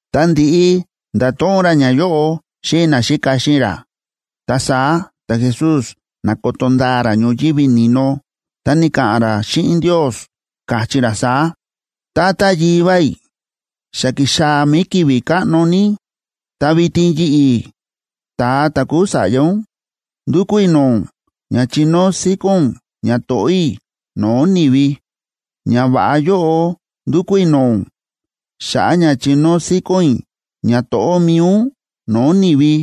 Ta ndi̱ꞌi nda̱to̱ꞌon ra ñayóꞌo xíꞌin naxíka xíꞌin ra, ta saá ta̱Jesús na̱koto ndaa ra ñoyívi ni̱no, ta ni̱ka̱ꞌa̱n ra xíꞌin Ndios, káchí ra saá: ―Tata Yivá i̱, xa ki̱xaa̱ mi̱i ki̱vi̱ káꞌno ní. Ta vitin yi̱ꞌi̱, ta̱a ta̱ kúu Sa̱ꞌya ún, ndúkú i̱ no̱o̱ ún ña chinóo síkón ún ñato̱ꞌó i̱ no̱o̱ ni̱vi. Ñava̱ꞌa yóꞌo ndúkú i̱ no̱o̱ ún xa̱ꞌa̱ ña chinóo síkón i̱ ñato̱ꞌó mi̱i ún no̱o̱ ni̱vi.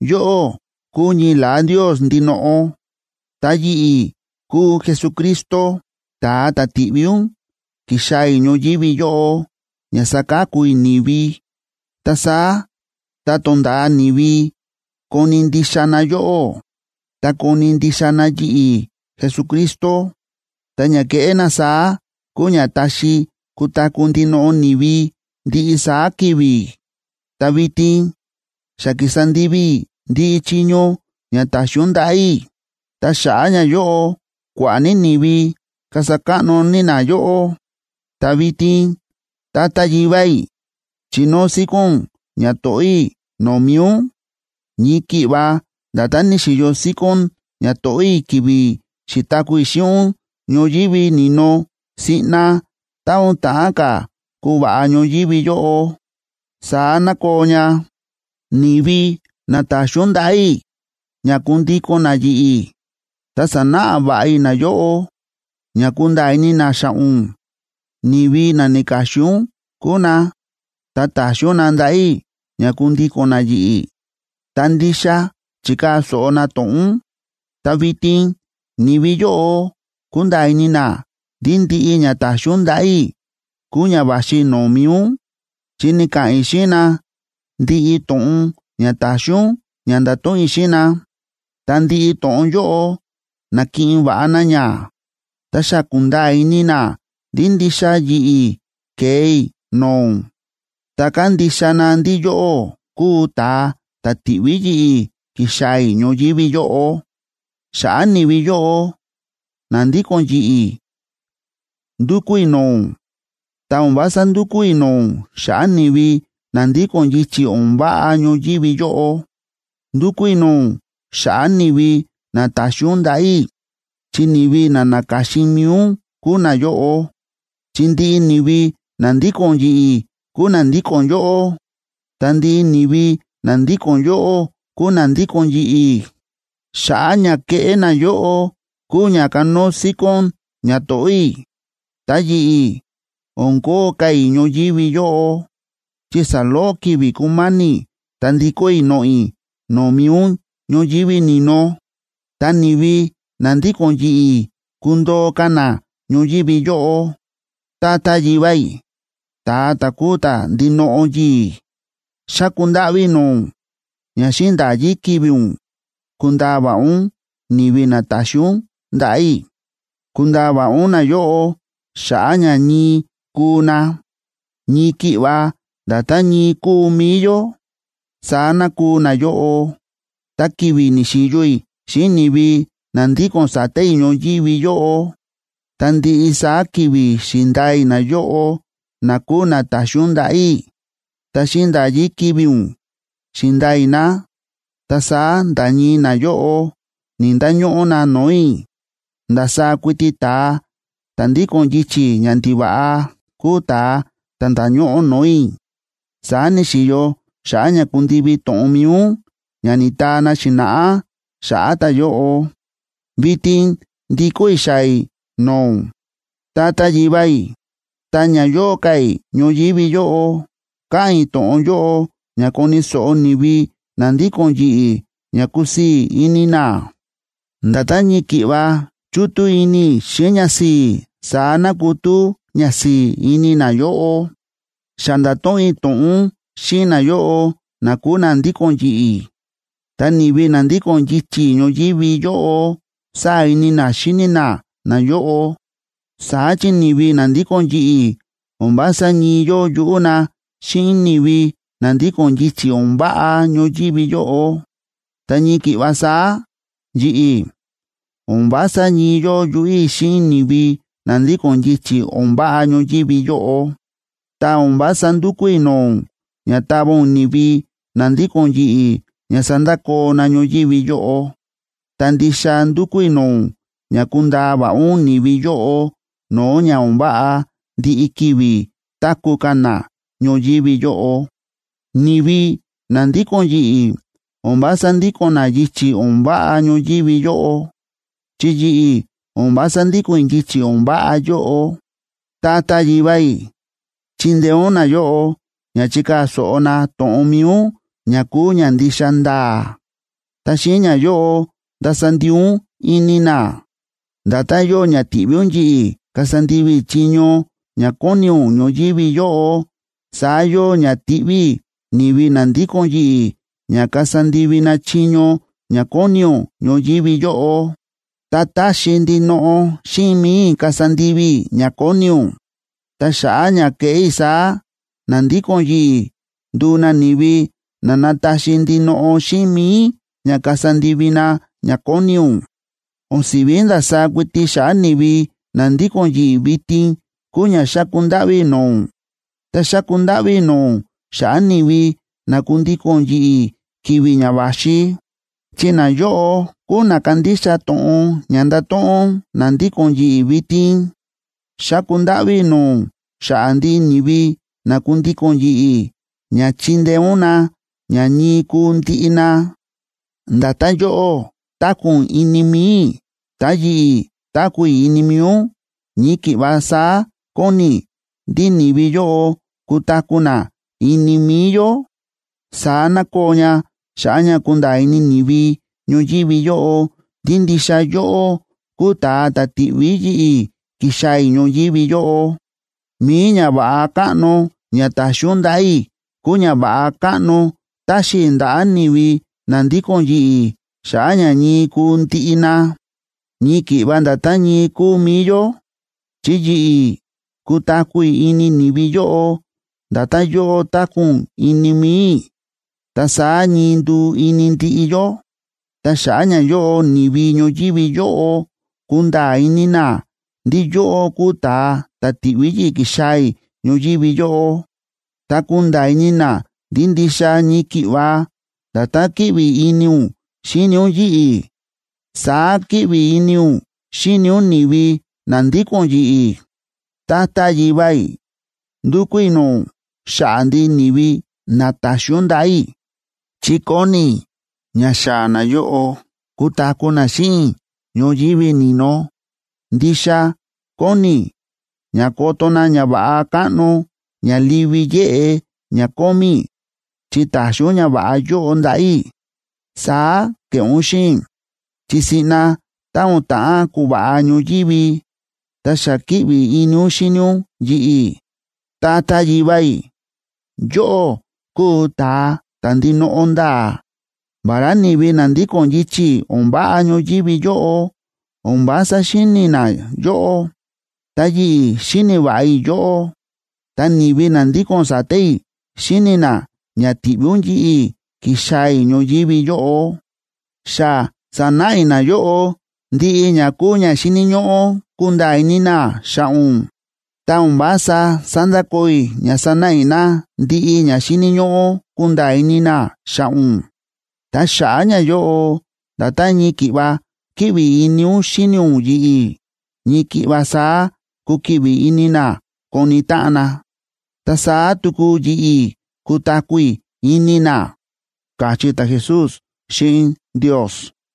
Yóꞌó kúu ñii la̱á Ndios ndinoꞌo, ta yi̱ꞌi̱ kúu Jesucristo, ta̱a ta̱ ti̱ꞌví ún ki̱xaa̱ i̱ ñoyívi yóꞌo ña saka̱ku i̱ ni̱vi. Ta saá tá tonda̱a ni̱vi koni̱ ndixa na yóꞌó, ta koni̱ ndixa na yi̱ꞌi̱ Jesucristo, ta ña ke̱ꞌé na saá kúu ña táxi kutaku̱ ndinoꞌo ni̱vi ndiꞌi saá ki̱vi̱. ’Ta vitin xa ki̱sa ndivi i̱ ndiꞌi chiño ña ta̱xi ún ndaꞌa̱ i̱, ta xa̱ꞌa̱ ñayóꞌo kua̱ꞌa̱ ní ni̱vi kasa káꞌno ní na yóꞌó. Ta vitin, Tata Yivá i̱, chinóo síkón ún ñato̱ꞌó i̱ no̱o̱ mi̱i ún. Ñii ki̱ꞌva nda̱tán ni̱xi̱yo síkón ñato̱ꞌó i̱ ki̱vi̱ xi̱taku̱ i̱ xíꞌin ún ñoyívi ni̱no siꞌna ta̱ o̱n ta̱ꞌán ka̱ kuva̱ꞌa ñoyívi yóꞌo, saá ná koo ña. ’Ni̱vi na ta̱xi ún ndaꞌa̱ i̱ ña kundíko̱n na yi̱ꞌi̱, ta sa̱náꞌa va̱ꞌa i̱ nayóꞌo ña kunda̱a̱ ini na xa̱ꞌa̱ ún. Ni̱vi na na̱ka̱xin ún kúu na, ta ta̱xi ún na ndaꞌa̱ i̱ ña kundíko̱n na yi̱ꞌi̱, ta ndixa chi̱kaa̱ so̱ꞌo na to̱ꞌon ún. Ta vitin ni̱vi yóꞌo kúnda̱a̱ ini na ndí ndiꞌi ña ta̱xi ún ndaꞌa̱ i̱ kúu ña va̱xi no̱o̱ mi̱i ún, chi ni̱ka̱ꞌa̱n i̱ xíꞌin na ndiꞌi to̱ꞌon ña ta̱xi ún ña ndato̱ꞌon i̱ xíꞌin na. Ta ndiꞌi to̱ꞌon yóꞌo na̱kiꞌin va̱ꞌa na ña, ta xa ku̱nda̱a̱ ini na ndí ndixa yi̱ꞌi̱ ke̱e i̱ no̱o̱ ún, ta kándixa na ndí yóꞌó kúu ta̱a ta̱ ti̱ꞌví yi̱ꞌi̱ ki̱xaa̱ i̱ ñoyívi yóꞌo. ’Xa̱ꞌa̱ ni̱vi yóꞌo na ndíko̱n yi̱ꞌi̱ ndúkú i̱ no̱o̱ ún, ta o̱n vása ndúkú i̱ no̱o̱ ún xa̱ꞌa̱ ni̱vi na ndíko̱n yichi̱ o̱n váꞌa ñoyívi yóꞌo. Ndúkú i̱ no̱o̱ ún xa̱ꞌa̱ ni̱vi na ta̱xi ún ndaꞌa̱ i̱, chi ni̱vi na na̱ka̱xin mi̱i ún kúu nayóꞌo. Chi ndiꞌi ni̱vi na ndíko̱n yi̱ꞌi̱ kúu na ndíko̱n yóꞌó, ta ndiꞌi ni̱vi na ndíko̱n yóꞌó kúu na ndíko̱n yi̱ꞌi̱. Xa̱ꞌa̱ ña kéꞌé nayóꞌo kúu ña kánóo síkón ñato̱ꞌó i̱. ’Ta yi̱ꞌi̱, o̱n kóo ka̱ i̱ ñoyívi yóꞌo, chi saloꞌo ki̱vi̱ kúma̱ni̱ ta ndikó i̱ noꞌo̱ i̱ no̱o̱ mi̱i ún ñoyívi ni̱no, ta ni̱vi na ndíko̱n yi̱ꞌi̱ kundoo ka̱ na ñoyívi yóꞌo. Tata Yivá i̱, ta̱a ta̱ kúu ta̱ ndinoꞌo yi̱i̱, xáku ndáꞌví i̱ no̱o̱ ún ña xíꞌin nda̱yí ki̱vi̱ ún kundaa va̱ꞌa ún ni̱vi na ta̱xi ún ndaꞌa̱ i̱. Kundaa va̱ꞌa ún nayóꞌo xa̱ꞌa̱ ña ñii kuu na. Ñii ki̱ꞌva nda̱tán ñii kúu mi̱i yó, saá ná kuu nayóꞌo. Ta ki̱vi̱ ni̱xi̱yo i̱ xíꞌin ni̱vi na ndíko̱n sa̱ta̱ i̱ ñoyívi yóꞌo, ta ndiꞌi saá ki̱vi̱ xi̱ndaa i̱ nayóꞌo na kúu na ta̱xi ún ndaꞌa̱ i̱. Ta xíꞌin nda̱yí ki̱vi̱ ún xi̱ndaa i̱ na, ta saá nda̱ ñii nayóꞌo ni̱‑ndañóꞌó na no̱o̱ i̱. Ndasaá kuiti ta̱a ta̱ ndíko̱n yichi̱ ñandiva̱ꞌa kúu ta̱a ta̱ nda̱ñóꞌó no̱o̱ i̱. Saá ni̱xi̱yo xa̱ꞌa̱ ña kundivi to̱ꞌon mi̱i ún ña ni̱taa na xi̱na̱ꞌá xa̱ꞌa̱ ta̱yóꞌo. ’Vitin ndikó i̱ xaa̱ i̱ no̱o̱ ún, Tata Yivá i̱. Ta ña yóo ka̱ i̱ ñoyívi yóꞌo, káꞌa̱n i̱ to̱ꞌon yóꞌo ña koni̱ so̱ꞌo ni̱vi na ndíko̱n yi̱ꞌi̱ ña kusii̱ ini na. Nda̱tán ñii ki̱ꞌva chútú ini i̱ xíꞌin ñasi̱i̱, saá ná kutú ñasi̱i̱ ini nayóꞌo. Xa nda̱to̱ꞌon i̱ to̱ꞌon ún xíꞌin nayóꞌo na kúu na ndíko̱n yi̱ꞌi̱. Ta ni̱vi na ndíko̱n yichi̱ ñoyívi yóꞌo sáa̱ ini na xíni na nayóꞌo, saá chi ni̱vi na ndíko̱n yi̱ꞌi̱ o̱n vása ñii yóo yuꞌú na xíꞌin ni̱vi na ndíko̱n yichi̱ o̱n váꞌa ñoyívi yóꞌo. Ta ñii ki̱ꞌva saá yi̱ꞌi̱, o̱n vása ñii yóo yuꞌú i̱ xíꞌin ni̱vi na ndíko̱n yichi̱ o̱n váꞌa ñoyívi yóꞌo. Ta o̱n vása ndukú i̱ no̱o̱ ún ña tava ún ni̱vi na ndíko̱n yi̱ꞌi̱ ña sandakoo na ñoyívi yóꞌo, ta ndixa ndukú i̱ no̱o̱ ún ña kundaa va̱ꞌa ún ni̱vi yóꞌo no̱o̱ ña o̱n váꞌa ndiꞌi ki̱vi̱ táku̱ ka̱ na ñoyívi yóꞌo. Ni̱vi na ndíko̱n yi̱ꞌi̱ o̱n vása ndíko̱n na yichi̱ o̱n váꞌa ñoyívi yóꞌo, chi yi̱ꞌi̱ o̱n vása ndíko̱n i̱ yichi̱ o̱n váꞌa yóꞌo. Tata Yivá i̱, chindeé ún nayóꞌo ña chikaa̱ so̱ꞌo na to̱ꞌon mi̱i ún ña kúu ña ndixa nda̱a̱, ta xíꞌin ñayóꞌo, ndasa ndii ún ini na. Nda̱tán yóo ña ti̱ꞌví ún yi̱ꞌi̱ kasa ndivi i̱ chiño ña kóni ún ñoyívi yóꞌo, saá yóo ña tiꞌví i̱ ni̱vi na ndíko̱n yi̱ꞌi̱ ña kasa ndivi na chiño ña kóni ún ñoyívi yóꞌo. Ta táxi ndinoꞌo xíꞌin mi̱i i̱ kasa ndivi i̱ ña kóni ún. Ta xa̱ꞌa̱ ña kéꞌé i̱ saá, na ndíko̱n yi̱ꞌi̱ nduu na ni̱vi na nataxi ndinoꞌo xíꞌin mi̱i ña kasa ndivi na ña kóni ún. ’O̱n si̱ví ndasaá kuiti xa̱ꞌa̱ ni̱vi na ndíko̱n yi̱ꞌi̱ vitin kúu ña xáku ndáꞌví i̱ no̱o̱ ún, ta xáku ndáꞌví i̱ no̱o̱ ún xa̱ꞌa̱ ni̱vi na kundíko̱n yi̱ꞌi̱ ki̱vi̱ ña va̱xi, chi nayóꞌo kúu na kandixa to̱ꞌon ña ndato̱ꞌon na ndíko̱n yi̱ꞌi̱ vitin. Xáku ndáꞌví i̱ no̱o̱ ún xa̱ꞌa̱ ndiꞌi ni̱vi na kundíko̱n yi̱ꞌi̱ ña chindeé ún na ña ñii kuu ndiꞌi na. Nda̱tán yóꞌó táku̱ ún ini mi̱i i̱, ta yi̱ꞌi̱ táku̱ i̱ ini mi̱i ún, ñii ki̱ꞌva saá kóni i̱ ndí ni̱vi yóꞌo kutaku̱ na ini mi̱i yó. Saá ná koo ña xa̱ꞌa̱ ña kunda̱a̱ ini ni̱vi ñoyívi yóꞌo ndí ndixa yóꞌó kúu ta̱a ta̱ ti̱ꞌví yi̱ꞌi̱ ki̱xaa̱ i̱ ñoyívi yóꞌo. Mi̱i ñava̱ꞌa káꞌno ña ta̱xi ún ndaꞌa̱ i̱ kúu ñava̱ꞌa káꞌno táxi i̱ ndaꞌa̱ ni̱vi na ndíko̱n yi̱ꞌi̱ xa̱ꞌa̱ ña ñii kuu ndiꞌi na, ñii ki̱ꞌva nda̱tán ñii kúu mi̱i yó. Chi yi̱ꞌi̱ kutaku̱ i̱ ini ni̱vi yóꞌo, nda̱tán yóꞌó táku̱ ún ini mi̱i i̱. Ta saá ñii nduu ini ndiꞌi yó, ta xa̱ꞌa̱ ñayóꞌo ni̱vi ñoyívi yóꞌo kunda̱a̱ ini na ndí yóꞌó kúu ta̱a ta̱ ti̱ꞌví yi̱ꞌi̱ ki̱xaa̱ i̱ ñoyívi yóꞌo, ta kunda̱a̱ ini na ndí ndixa ñii ki̱ꞌva nda̱tán kíꞌvi ini ún xíni ún yi̱ꞌi̱, saá kíꞌvi ini ún xíni ún ni̱vi na ndíko̱n yi̱ꞌi̱. ’Tata Yivá i̱, ndukú i̱ no̱o̱ ún xa̱ꞌa̱ ndiꞌi ni̱vi na ta̱xi ún ndaꞌa̱ i̱, chi kóni i̱ ña xaa̱ nayóꞌo kutaku̱ na xíꞌin i̱ ñoyívi ni̱no. Ndixa kóni i̱ ña koto na ñava̱ꞌa káꞌno ña livi yéꞌe ña kómí i̱ chi ta̱xi ún ñava̱ꞌa yóꞌo ndaꞌa̱ i̱. Saá ke̱ꞌé ún xíꞌin i̱, chi siꞌna tá o̱n ta̱ꞌán kuva̱ꞌa ñoyívi, ta xa kíꞌvi ini ún xíni ún yi̱ꞌi̱. Tata Yivá i̱, yóꞌó kúu ta̱a ta̱ ndinoꞌo nda̱a̱. Vará ni̱vi na ndíko̱n yichi̱ o̱n váꞌa ñoyívi yóꞌo o̱n vása xíni̱ na yóꞌó, ta yi̱ꞌi̱ xíni̱ va̱ꞌa i̱ yóꞌó, ta ni̱vi na ndíko̱n sa̱ta̱ i̱ xíni̱ na ña ti̱ꞌví ún yi̱ꞌi̱ ki̱xaa̱ i̱ ñoyívi yóꞌo. Xa sa̱náꞌa i̱ nayóꞌo ndiꞌi ña kúu ña xíni̱ ñóꞌó kunda̱a̱ ini na xa̱ꞌa̱ ún, ta o̱n vása sandakoo i̱ ña sanáꞌa i̱ na ndiꞌi ña xíni̱ ñóꞌó kunda̱a̱ ini na xa̱ꞌa̱ ún. Ta xa̱ꞌa̱ ñayóꞌo nda̱tán ñii ki̱ꞌva kíꞌvi ini ún xíni ún yi̱ꞌi̱, ñii ki̱ꞌva saá kukiꞌvi ini na koni táꞌan na. Ta saá tuku yi̱ꞌi̱ kutaku̱ i̱ ini na ―káchí ta̱Jesús xíꞌin Ndios.